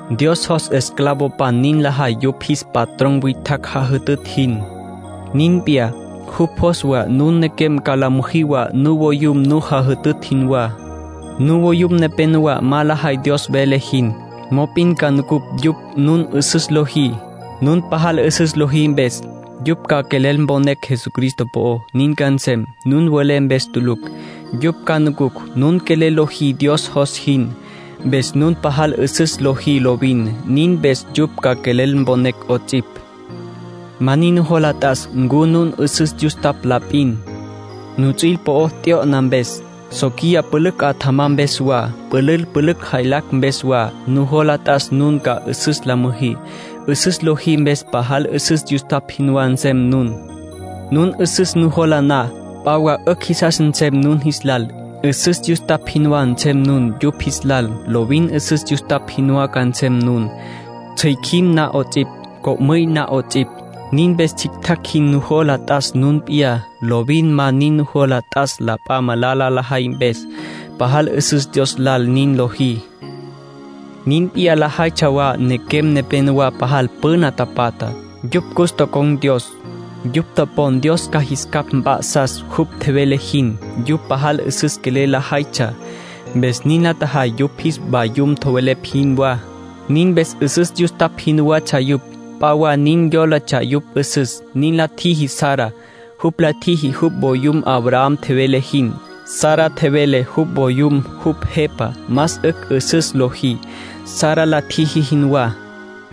Dios jos esclavopan nin lajay yupj jis patrón witjacj jajütütj jin. Nin p'iyá, jupj jos wa nun nequem ca la müjí wa nuvoyum nu jajütütj jinwá. Nuvoyum nepenowá ma lajay Dios vele jin. Mop'in ca nucucj yupj nun 'üsüs lojí. Nun pajal 'üsüs lojí mpes, yupj ca quelel mponecj Jesucristo po'ó. Nin ca nsem, nun welé mpes tulucj. Yupj ca nucucj nun quelel lojí Dios jos jin, mpes nun pajal 'üsüs lojí lovin. Nin mpes yupj ca quelel mponecj 'ots'ipj. Ma nin nujola t'as ncu nun 'üsüs yustapj la p'in, nuts'üil po'o tyo'na mpes, soquiya pülücj 'atjama mpes wa, pülül pülücj jaylacj mpes wa. Nujola t'as nun ca 'üsüs la müjí; 'üsüs lojí mpes pajal 'üsüs yustapj jinwá nsem nun. Nun 'üsüs nujola na, p'a wa 'ücj jisas nsem nun jis lal. 'Üsüs yustapj jinwá nsem nun yupj jis lal. Lovin 'üsüs yustapj jinwá ca nsem nun, tsjücjüim na 'ots'ipj, co'müy na 'ots'ipj. Nin mpes tsjictjacj jin nujola t'as nun p'iyá. Lovin ma nin nujola t'as la p'a malala lajay mpes. Pajal 'üsüs Dios lal nin lojí. Nin p'iyá lajaytsja wa nequem nepenowá pajal püna tapatjá. Yupj cus tocon̈ Dios. Yupj topon Dios ca jis capj mp'a'sas jupj tjevele jin. Yupj pajal 'üsüs quelel lajaytsja, mpes nin la tjajay yupj jis vayum tjowelepj jinwá. Nin mpes 'üsüs yustapj jinwatsja yupj; p'a wa nin yólatsja yupj 'üsüs. Nin la tjiji Sara. Jupj la tjiji jupj voyum Abraham tjevele jin. Sara tjevele jupj voyum jupj jepa. Más 'ücj 'üsüs lojí, Sara la tjiji jinwá.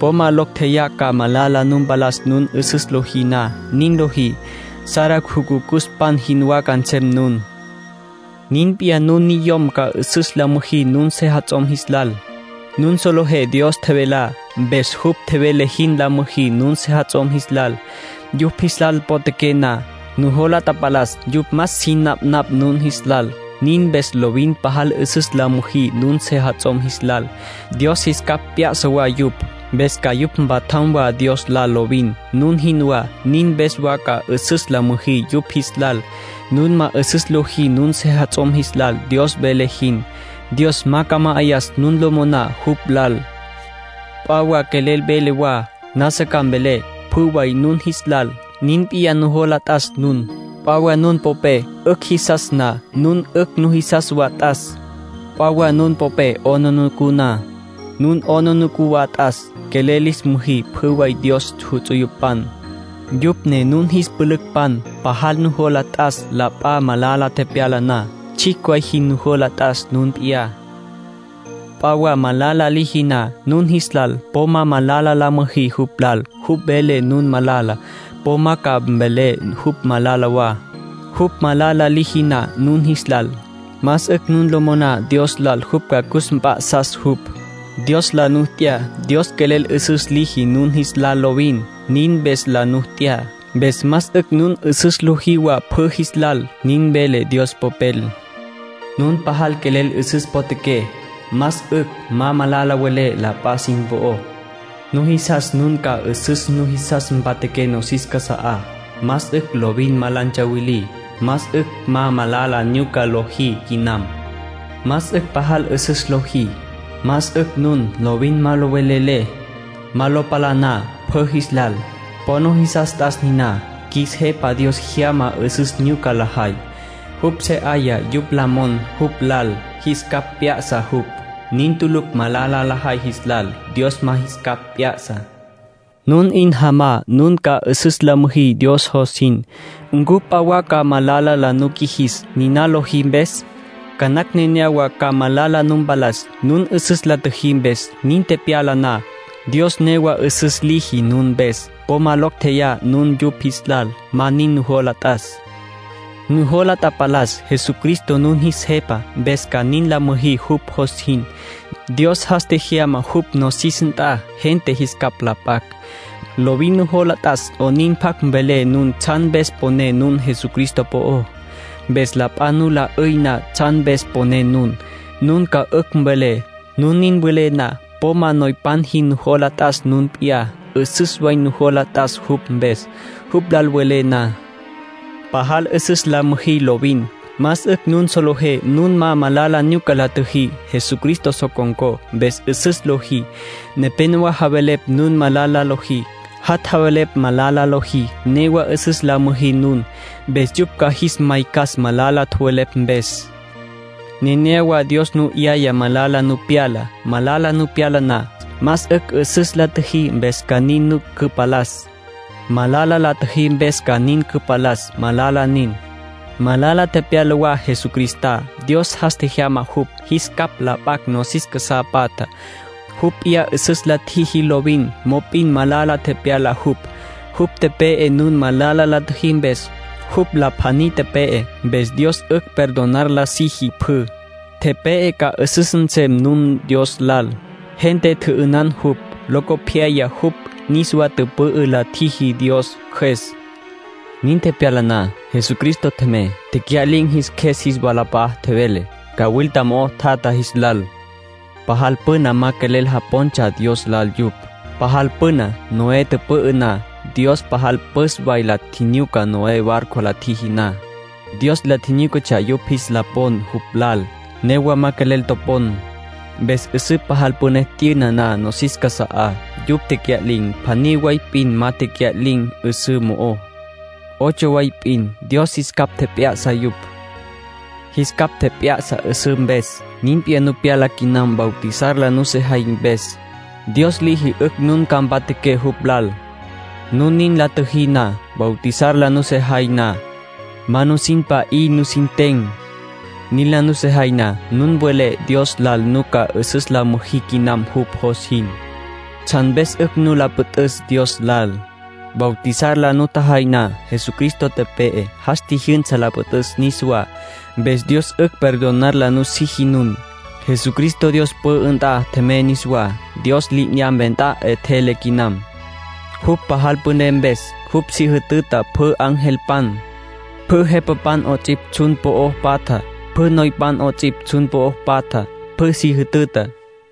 Po ma locj tjeyá ca malala nu mpalas nun 'üsüs lojí na. Nin lojí, Sara jucucuspan jinwá ca nsem nun. Nin p'iyá nun niyom ca 'üsüs la müjí nun sejats'om jis lal. Nun solejé Dios tjevelá, mpes jupj tjevele jin la müjí nun sejats'om jis lal, yupj jis lal potjaqué na. Nujola tapalas yupj más sin napnapj nun jis lal. Nin mpes lovin pajal 'üsüs la müjí nun sejats'om jis lal. Dios jis capj p'ya'sa wa yupj, mpes ca yupj mpatjam wa Dios lal lovin, nun jinwá. Nin mpes wa ca 'üsüs la müjí yupj jis lal. Nun ma 'üsüs lojí nun sejats'om jis lal, Dios vele jin, Dios ma ca ma'ayas nun lo moná jupj lal. P'a wa quelel velé wa. Nasa ca mvelé pjü way nun jis lal. Nin p'iyá nujola t'as nun. P'a wa nun popé 'ücj jisas na, nun 'ücj nujisas wa t'as. P'a wa nun popé 'aplijila na, nun 'aplijila wa t'as. Quelel lis müjí pjü way Dios ts'uyupan, yupj ne nun jis pülücpan. Pajal nujola t'as la p'a malala tepyala na. Tsjicj way jin nujola t'as nun p'iyá. P'a wa malala liji na nun jis lal, po ma malala la müjí jupj lal. Jupj vele nun malala, po ma ca mvelé jupj malala wa. Jupj malala liji na nun jis lal, más 'ücj nun lo moná Dios lal jupj ca cus mp'a'sas jupj. Dios la nu t'ya. Dios quelel 'üsüs liji nun jis lal lovin, nin mpes la nu t'ya. Mpes más 'ücj nun 'üsüs lojí wa pjü jis lal. Nin vele Dios Popel: “Nun pajal quelel 'üsüs potjaqué, más 'ücj ma malala welé la p'a sin po'ó. Nujisas nun ca 'üsüs nujisas mpatjaqué nosis casa'á, más 'ücj lovin ma la ntsawilí. Más 'ücj ma malala nyuca lojí quinam. Más 'ücj pajal 'üsüs lojí. Más 'ücj nun lovin ma lo velelé, ma lo palaná pjü jis lal. Po nujisas t'as niná. Qjuis Jepa Dios jyama 'üsüs nyuca lajay. Jupj se 'aya yupj la mon jupj lal. Jis capj p'ya'sa jupj. Nin tulucj malala lajay jis lal. Dios ma jis capj p'ya'sa.” Nun 'in jomá nun ca 'üsüs la müjí Dios jos jin, ¿ncu p'a wa ca malala la nu qjuijis, niná lojí mpes? Ca nacj nenéyawa ca malala nu mpalas, nun 'üsüs la tjüjí mpes. Nin tepyala na, Dios newa 'üsüs liji nun mpes. Po ma locj tjeyá nun yupj jis lal. Ma nin nujola t'as. Nujola tapalas Jesucristo nun jis Jepa, mpes ca nin la müjí jupj jos jin. Dios jas tjejyama jupj nosis nt'a gente jis capj la p'acj. Lovin nujola t'as 'onin pjac mvelé nun tsjan mpes poné nun Jesucristo po'ó. Mpes la p'a nu la 'üy na tsjan mpes poné nun, nun 'ücj ca mvelé. Nun nin welé na, po ma noypan jin nujola t'as nun p'iyá. 'Üsüs way nujola t'as jupj mpes, jupj lal welé na. Pajal 'üsüs la müjí lovin. Más 'ücj nun solejé nun ma malala nyuca la tjüjí. Jesucristo so con̈có, mpes 'üsüs lojí. Nepénowa javelepj nun malala lojí. Jat' javelepj malala lojí. Newa 'üsüs la müjí nun, mpes yupj ca jis maycas malala tjowelepj mpes. Nenéyawa Dios nu 'yaya malala nu pyala. Malala nu pyala na, más 'ücj 'üsüs la tjüjí mpes ca nin nu cüpalas. Malala la tjüjí mpes ca nin cüpalas, malala nin. Malala tepyala wa Jesucristá. Dios jas tjejyama jupj, jis capj la p'acj nosis casá patjá. Jupj p'iyá 'üsüs la tjiji lovin. Mop'in malala tepyala jupj; jupj tepe'e nun malala la tjüjí mpes. Jupj la pjaní tepe'e, mpes Dios 'ücj perdonar la siji pjü. Tepe'e ca 'üsüs nsem nun Dios lal. Gente tjü'ünan jupj; locopyaya jupj niswa tüpü'ü la tjiji Dios Cjües. Nin tepyala na, Jesucristo tjemey, tecya'lin̈ jis qjues jis walap'a'a tjevele, cawilta mo'o tjatja jis lal. Pajal püna ma quelel japontsja Dios lal yupj. Pajal püna, Noé tüpü'ü na, Dios pajal püs way la tjinyuca Noé barco la tjiji na. Dios la tjinyúcatsja yupj jis la pon jupj lal. Newa ma quelel topon. Mpes 'üsǘ pajal püné t'yüna na nosis casa'á, yupj tecya'lin̈. Pjaní way p'in ma tecya'lin̈ 'üsǘ mo'ó, ocho way p'in; Dios jis capj tjep'ya'sa yupj. Jis capj tjep'ya'sa 'üsǘ mpes. Nin p'iyá nu pyala quinam bautizar la nusejay mpes. Dios liji 'ücj nun ca mpatjaqué jupj lal, nun nin la tjüjí na. Bautizar la nusejay na, ma nusin pa'í nusin ten. Nin la nusejay na, nun welé Dios lal nun ca 'üsüs la müjí quinam jupj jos jin. Tsjan mpes 'ücj nu la püt'üs Dios lal, bautizar la nutjajay na: Jesucristo tepe'e, jas tjijyünsa la püt'üs niswá. Mpes Dios 'ücj perdonar la nusiji nun. Jesucristo Dios pü'ü nt'a tjemey niswá. Dios li'inyampe nt'a 'etjele quinam, jupj pajal püné mpes. Jupj si jütüta pjü angelpan, pjü jepapan 'ots'ipj tsjun po'o patjá, pjü noypan 'ots'ipj tsjun po'o patjá. Pjü si jütüta.